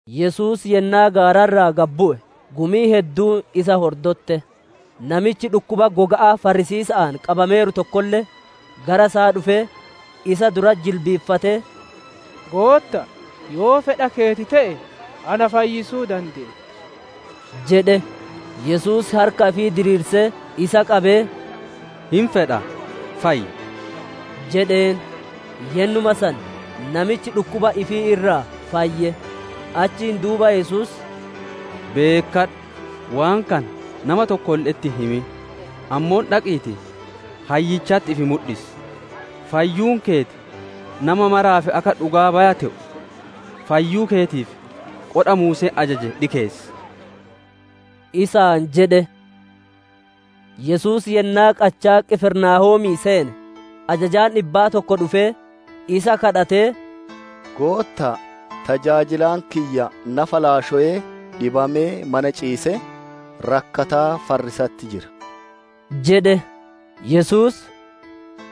Yesuus yennaa gaara irraa gad bu'e, gumiin hedduun isa hordotte. Namichi dhukkuba goga'aa farrisiisa'aan qabameeru tokkolle gara isaa dhufee, isa duratti jilbiiffatee, «Gootta'a, yoo fedha keeti te'e na fayyisuu dandeetta» jedhe. Yesuus harka ifii diriirsee isa qabee, «Hin fedha, fayyi!» jedheen; yennuma san namichi dhukkuba ifii irraa fayye. Achiin duuba Yesuus, «Beekkadhu! Waan kana nama tokkolle'etti hin himin; ammoo dhaqiitii, hayyichatti ifi mudhisi; fayyuun keeti nama maraaf akka dhugaa baya te'u, fayyuu keetiif qodha Muuseen ajaje dhikeessi!» isaan jedhe. Yesuus yennaa qachaa Qifirnaahoomii seene, ajajaan dhibba tokko dhufee isa kadhatee, «Gootta'a, tajaajilaan kiyya nafa laashowee, dhibamee mana ciisee, rakkataa farriisatti jira» jedhe. Yesuus,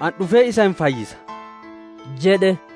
«Ani dhufee isa hin fayyisa» jedhe.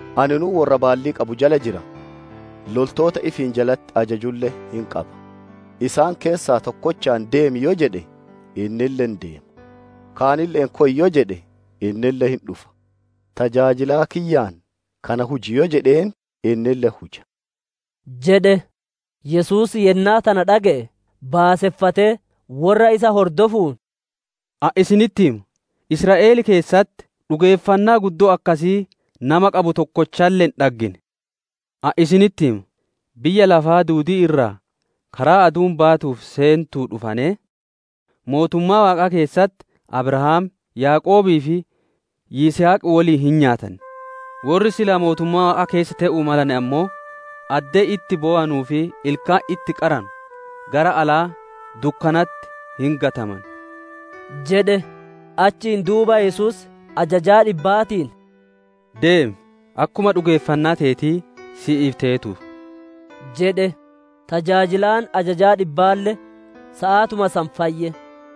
Aninuu worra baalli qabu jala jira, loltoota ifiin jalatti ajajulle qaba. Isaan keessaa tokkochaan, ‹Deemi!› yoo jedheen, innille hin deema; kaanille'een, ‹Koy!› yoo jedheen, innille hin dhufa; tajaajilaa kiyyaan, ‹Kana huji!› yoo jedheen, innille hin huja» jedhe. Yesuus yennaa tana dhage'e, baaseffatee worra isa hordofuun, «Ani isinitti hima, Israa'el keessatti dhugeeffannaa guddoo akkasii nama qabu tokkochalle hin dhaggine. Ani isinitti hima, biyya lafa duudii irraa karaa aduun baatuu fi seentuu dhufanee, mootummaa Waaqaa keessatti Abrahaam, Yaaqoobii fi Yisihaq woliin hin nyaatan; worri mootummaa Waaqaa keessa te'uu male ammoo addee itti bowanuu fi ilkaan itti qaranu gara alaa dukkanatti hin gataman» jedhe. Achiin duuba Yesuus ajajaa dhibbaatiin, «Deemi; akkuma dhugeeffanna teetii si'iif teetuu» jedhe. Tajaajilaan ajajaa dhibbaalle saatuma san fayye.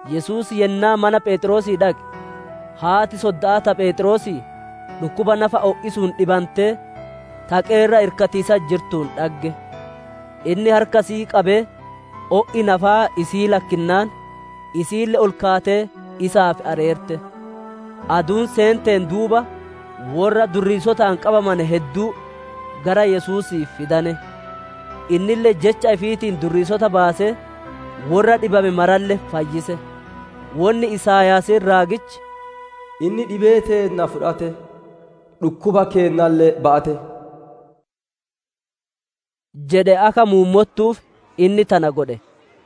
Yesuus yennaa mana Pheexroosii dhaqe, haati sodda'aa ta Pheexroosii dhukkuba nafa o'isuun dhibantee taqee irra irkatiisatti jirtuun dhagge. Inni harka isi'ii qabee, o'i nafaa isii lakkinnaan, isiille ol kaatee isaaf areerte. Aduun seenteen duuba, worra durriisotaan qabamane hedduu gara Yesuusii fidane. Innille jecha ifiitiin durriisota baasee, worra dhibame maralle fayyise. Wonni Isaayaasiin raagichi, «Inni dhibee teenna fudhate, dhukkuba keennalle ba'ate» jedhe akka muummottuuf inni tana godhe.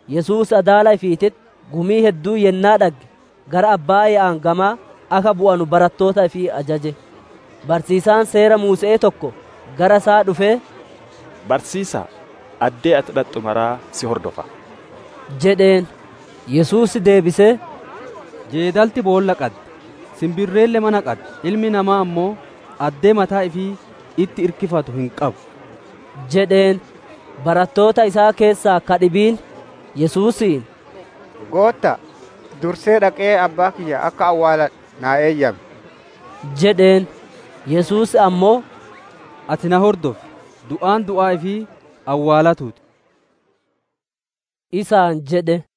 Yesuus adaala ifiititti gumii hedduu yennaa dhagge, gara abbaaya'aan gamaa akka bu'anu barattoota ifii ajaje. Barsiisaan Seera Muuse'ee tokko gara isaa dhufee, «Barsiisa'a! Addee ati dhaxxu mara si hordofa» jedheen. Yesuus deebisee, «Jeedalti boolla qaddi; sinbirreelle mana qaddi; Ilmi namaa ammoo addee mataa ifii itti irkifatu hin qabu» jedheen. Baratoota isaa keessaa ka dhibiin, Yesuusiin, «Gootta'a, dursee dhaqee abbaa kiyya akka awwaaladhu naa eeyyam» jedheen. Yesuus ammoo, «Ati na hordofi! Du'aan du'aa ifii awwaalatuu ti» isaan jedhe.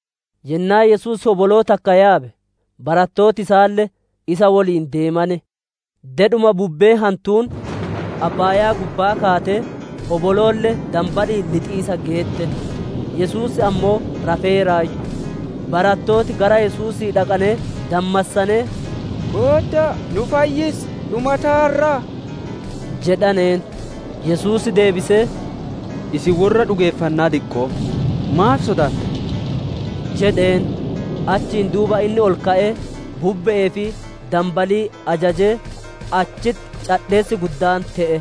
Yennaa Yesuus hoboloo takka yaabe, barattooti isaalle isa woliin deemane. Dedhuma bubbeen hantuun abbaayaa gubbaa kaatee, hoboloolle danbali'iin lixiisa geette; Yesuus ammoo rafeeraayyu. Barattooti gara Yesuusii dhaqanee dammassanee, «Gootta'a, nu fayyisi! Dhumataarraa!» jedhaneen. Yesuus deebisee, «Isin worra dhugeeffannaa diqqo'oo, maaf sodaattan?» jedheen. Achiin duuba inni ol ka'ee bubbe'ee fi danbalii ajajee, achitti cadheessi guddaan te'e.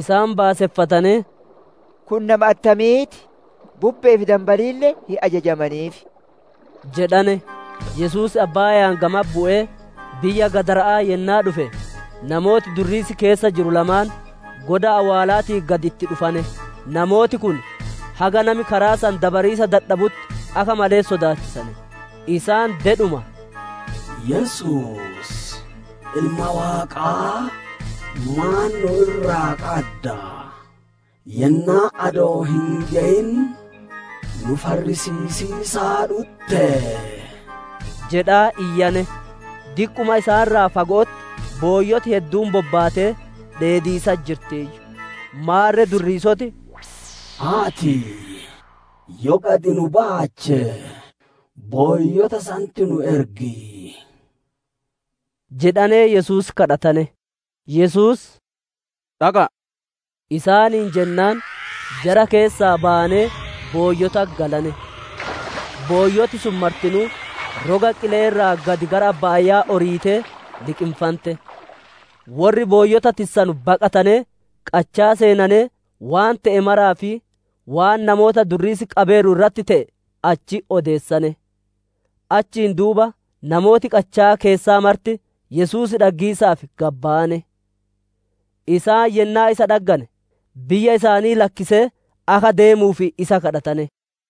Isaan baaseffatanee, «Kun nama attamii ti? Bubbe'ee fi danbaliille hin ajajamaniif!» jedhane. Yesuus abbaaya'aan gamatti bu'ee biyya Gadara'aa yennaa dhufe, namooti durriisi keessa jiru lamaan goda awwaalaatii gad itti dhufane; namooti kun haga nami karaa san dabariisa dadhabutti akka malee sodaachisane. Isaan dedhuma, «Yesuus, Ilma Waaqaa, maan nu irraa qadda? Yennaan adoo hin geyin nu farrisiisiisa dhuttee?» jedhaa iyyane. Diqquma isaan irraa fago'otti booyyoti hedduun bobbaatee dheediisatti jirtiiyyu. Maarre durriisoti, «Ati yoo gad nu baache, booyyota sanitti nu ergi» jedhanee Yesuus kadhatane. Yesuus, «Dhaqa'a!» isaaniin jennaan, jara keessaa bayanee booyyotatti galane. Booyyoti sun martinuu roga qile'ee irraa gad gara abbaaya'aa oriitee liqinfante. Worri booyyota tissanu baqatanee qachaa seenanee, waan te'e maraa fi waan namoota durriisi qabeeru irratti te'e achitti odeessane. Achiin duuba namooti qachaa keessaa marti Yesuus dhaggiisaaf gad bayane; isaan yennaa isa dhaggane, biyya isaanii lakkisee akka deemuuf isa kadhatane.